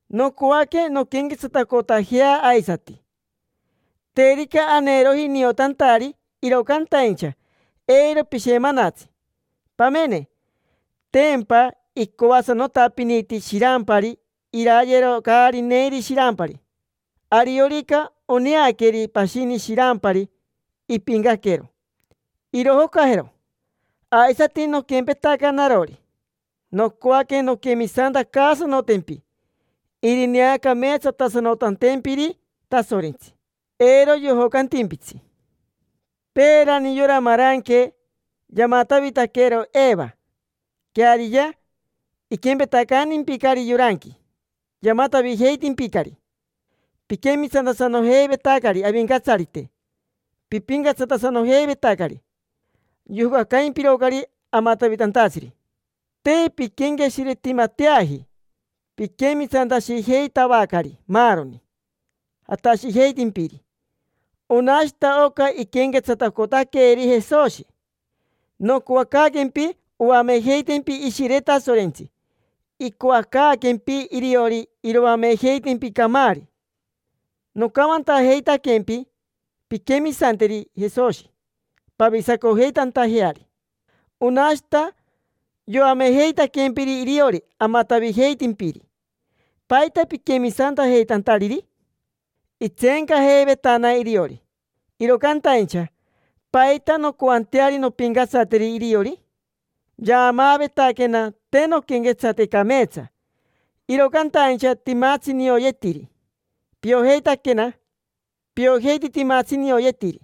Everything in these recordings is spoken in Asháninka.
Nocoaque nonquenquetsatacotajea aisati. Terica aneeroji niotantari, iro cantaincha, eiro pishemanatsi. Pamene, tempa icoasanotapiniti shirampari irayero caari neiri shirampari. Ariorica oneaqueri pashini shirampari impiincaquero, irojocajero. Aisati noquempetaca narori, nocoaque nonquemisantacaasanotempi irineacameetsatasanotantempiri Tasorentsi, eiro yojocantimpitsi. Peerani yora maranque yamatavitaquero Eva. Queariya, iquempetacantimpicari yoranqui: yamatavijeitimpicari. Piquemisantasanojeivetacari Avincatsarite, pipincatsatasanojeivetacari. Yojocacaimpirocari amatavitantatsiri. Te pinquenqueshiretimateaji. Piquemisantashijeitavacari maaroni jatashijeitimpiri. Onashita oca iquenquetsatacotaqueri Jesoshi. Nocoacaaquempi oamejeitempi Ishire Tasorentsi, icoacaaquempi iriori iroamejeitempi camaari. Nocamantajeitaquempi pinquemisanteri Jesoshi pavisacojeitantajeari, onashita yoamejeitaquempiri iriori amatavijeitimpiri. ¿Paita piquemisantajeitantariri? Itseencajeivetana iriori, iro cantaincha ¿paita noncoanteari nompincatsateri iriori? Yaamaavetaquena te nonquenquetsate cameetsa, iro cantaincha timatsi nioyetiri. Piojeitaquena, piojeiti timatsi nioyetiri.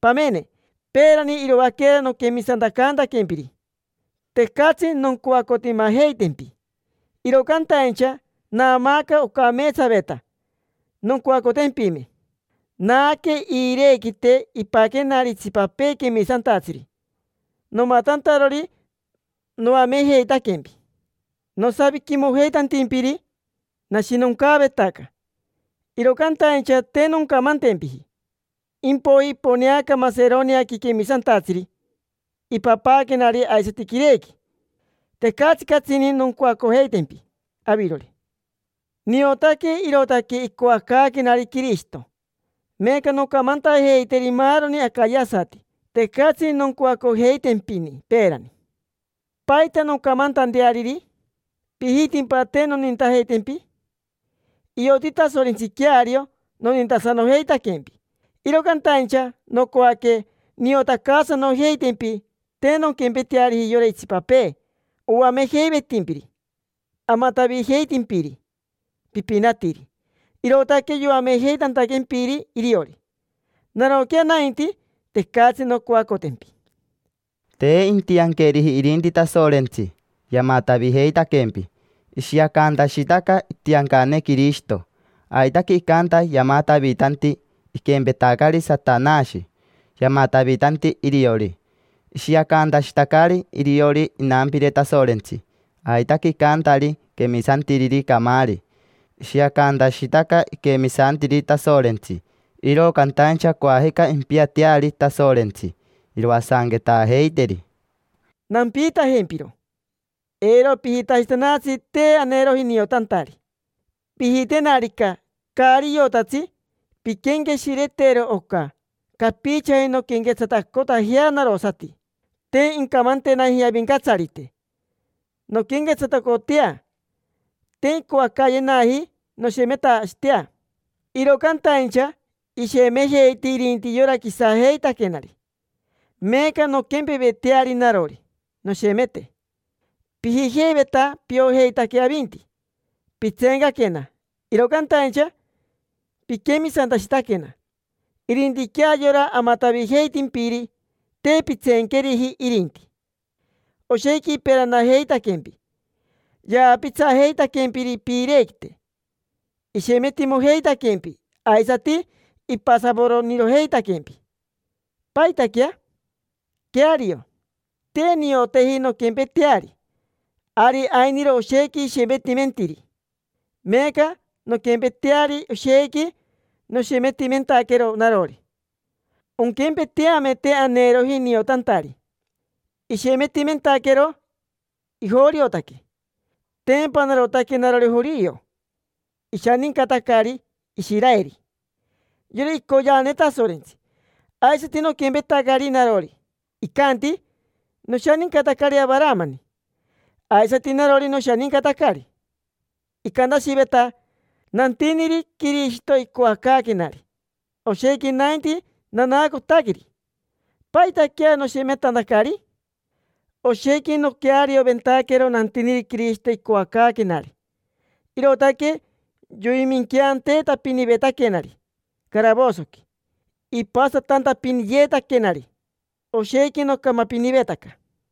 Pamene, peerani iroaquera noquemisantacantaquempiri, tecatsi noncoacotimajeitempi, iro cantaincha naamaaca ocameetsaveta noncoacotempime. Naaque iirequite ipaquenari itsipapee quemisantatsiri nomatantarori noamejeitaquempi. Nosaviquimojeitantimpiri, nashinoncaavetaca, iro cantaincha te noncamantempiji. Impoiji iponeaca Maseroniaqui quemisantatsiri, ipapaaquenari aisati quirequi. Tecatsi catsini noncoacojeitempi avirori. Niotaque irootaque icoacaaquenari Quirishito. Meeca noncamantajeiteri maaroni acayasati tecatsi noncoacojeitempini peerani. ¿Paita noncamantanteariri? ¿Pijitimpa te nonintajeitempi? Ioti Tasorentsi queario nonintasanojeitaquempi. Iro cantaincha nocoaque niotacaasanojeitempi te nonquempeteariji yora itsipapee oamejeivetimpiri, amatavijeitimpiri. Pipinatiri, irootaque yoamejeitantaquempiri iriori. Naroquea nainti, tecatsi noncoacotempi. Te intianqueriji irinti Tasorentsi. Yamatavijeitaquempi. Ishiacantashitaca itiancane Quirishito. Aitaque icanta, yamatavitanti, iquempetacari Satanashi, yamatavitanti iriori. Ishiacantashitacari iriori inampire Tasorentsi. Aitaque icantari quemisantiriri camaari: ishiacantashitaca iquemisantiri Tasorentsi. Iro cantaincha coajica impiateari Tasorentsi, iroasanquetaajeiteri. Nampiitajempiro: eiro pijitashitanatsi te aneeroji niotantari. Pijitenarica caari iotatsi, pinquenqueshiretero oca: capichaji nonquenquetsatacotajea narosati. Te incamantenaji Avincatsarite nonquenquetsatacotea, te incoacaayenaji noshemetashitea. Iro cantaincha ishemejeiti irinti yora quisajeitaquenari: meeca nonquempeveteari narori, noshemete. Pijijeiveta piojeitaque avinti, pitseencaquena, iro cantaincha piquemisantashitaquena. Irintiquea yora amatavijeitimpiri, te pintseenqueriji irinti. Oshequi iperanajeitaquempi, yaapitsajeitaquempiri piirequite, ishemetimojeitaquempi, aisati ipasavoronirojeitaquempi. ¿Paitaquea? Queario, te nioteji nonquempeteari. Ari ainiro oshequi ishemetimentiri: meeca nonquempeteari, oshequi noshemetimentaquero narori, onquempeteame te aneeroji niotantari. Ishementimentaquero ijoriotaque. Tempa narotaque narori jorio. Ishanincatacari Ishiraeri, yora icoyeane Tasorentsi. Aisati noquempetacari narori. Icanti: “Noshanincatacari Avaramani”. Aisati narori, noshanincatacari. Icantashiveta: “Nantiniri Quirishito icoacaaquenari”. Oshequi nainti nanaacotaqueri. ¿Paitaquea noshemetantacari? Oshequi noquearioventaquero nantiniri Quirishito icoacaaquenari, irootaque yoiminqueanteetapinivetaquenari caravosoqui, ipasatantapiniyeetaquenari. Oshequi nocamapinivetaca.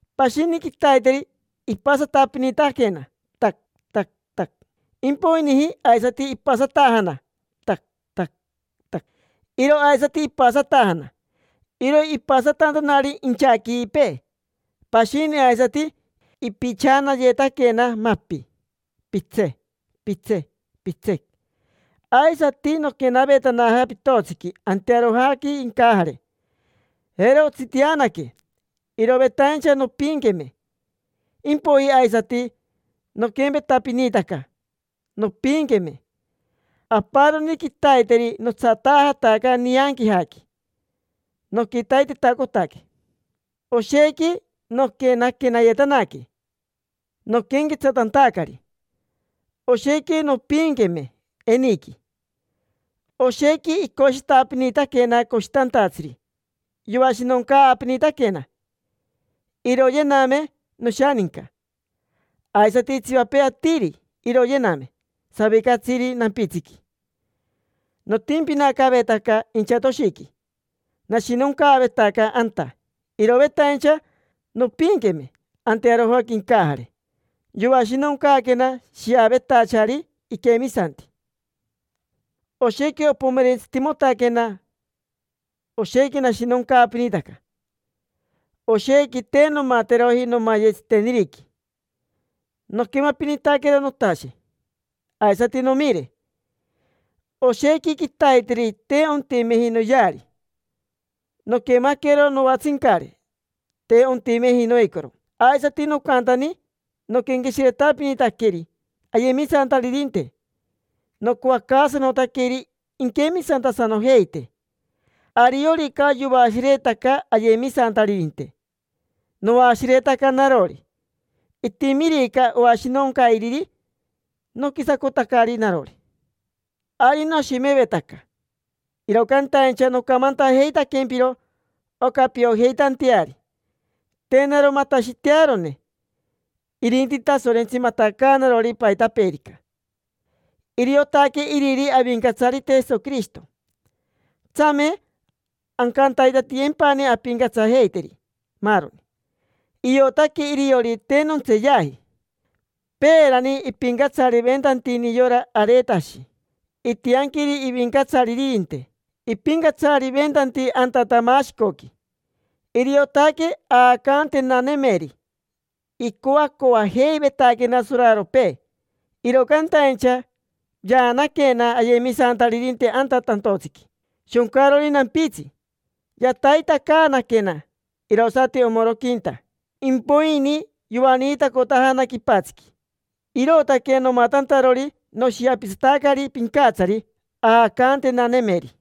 Pashini quitaiteri ipasanatapinitaquena, tac, tac, tac. Impoijini aisati ipasatajana, tac, tac, tac. Iro aisati ipasatajana. Iro ipasatantanari inchaquipee. Pashini aisati ipichanayetaquena mapi, pitsec, pitsec, pitsec. Aisati noquenavetanaja pitotsiqui antearojaqui incajare. Jero otsitianaque, irovetaincha nompiinqueme. Impoiji aisati noquempetapinitaca, nompiinqueme. Aparoni quitaiteri notsatajataca nianquijaqui, noquitaitetacotaque. Oshequi noquenaquenayetanaque noquenquetsatantacari. Oshequi nompiinqueme eniqui. Oshequi icoshitapinitaquena coshitantatsiri, yoashinoncaapinitaquena. Iroyename noshaninca, aisati itsipapee atiri. Iroyename savicatsiri nampitsiqui. Notimpinacavetaca inchatoshiqui, nashinoncaavetaca anta. Irovetaincha nompiinqueme antearojaqui incajare. Yoashinoncaaquena shiavetachari iquemisanti. Oshequi opomerentsitimotaquena, oshequi nashinoncaapinitaca. Oshequi te nomateroji nomaye tsiteniriqui. Noquemapinitaquero notashe aisati nomire. Oshequi quitaiteri te ontimeji noyeari. Noquemaquero noatsincare, te ontimeji noicoro. Aisati nocantani noquenqueshiretapinitaqueri ayemisantaririnte, nocoacaasanotaqueri inquemisantasanojeite. Ariorica yoashiretaca ayemisantaririnte, noashiretaca narori. Itimirica oashinoncairiri, noquisacotacari narori. Ari noshemevetaca, iro cantaincha nocamantajeitaquempiro oca piojeitanteari te naro matashitearone, irinti Tasorentsi matacaanarori paitapeerica. Iriotaque Iriri Avincatsarite Jesoquirishito, tsame ancantaitatiyempani ampincatsajeiteri maaroni. Iotaque iriori te nontseeyaji. Peerani ipincatsariventantini yora Aretashi. Itianquiri ivincatsaririnte ipincatsariventanti anta Tamashicoqui. Iriotaque aacantenanemeri. Icoacoajeivetaquena soraropee, iro cantaincha yaanaquena ayemisantaririnte anta tantotsiqui shoncarori nampitsi. Yataitacaanaquena irosati omoroquinta, impoini yoaniitacotajana quipatsiqui. Irootaque nomatantarori noshiapitsatacari pincatsari aacantenanemeri.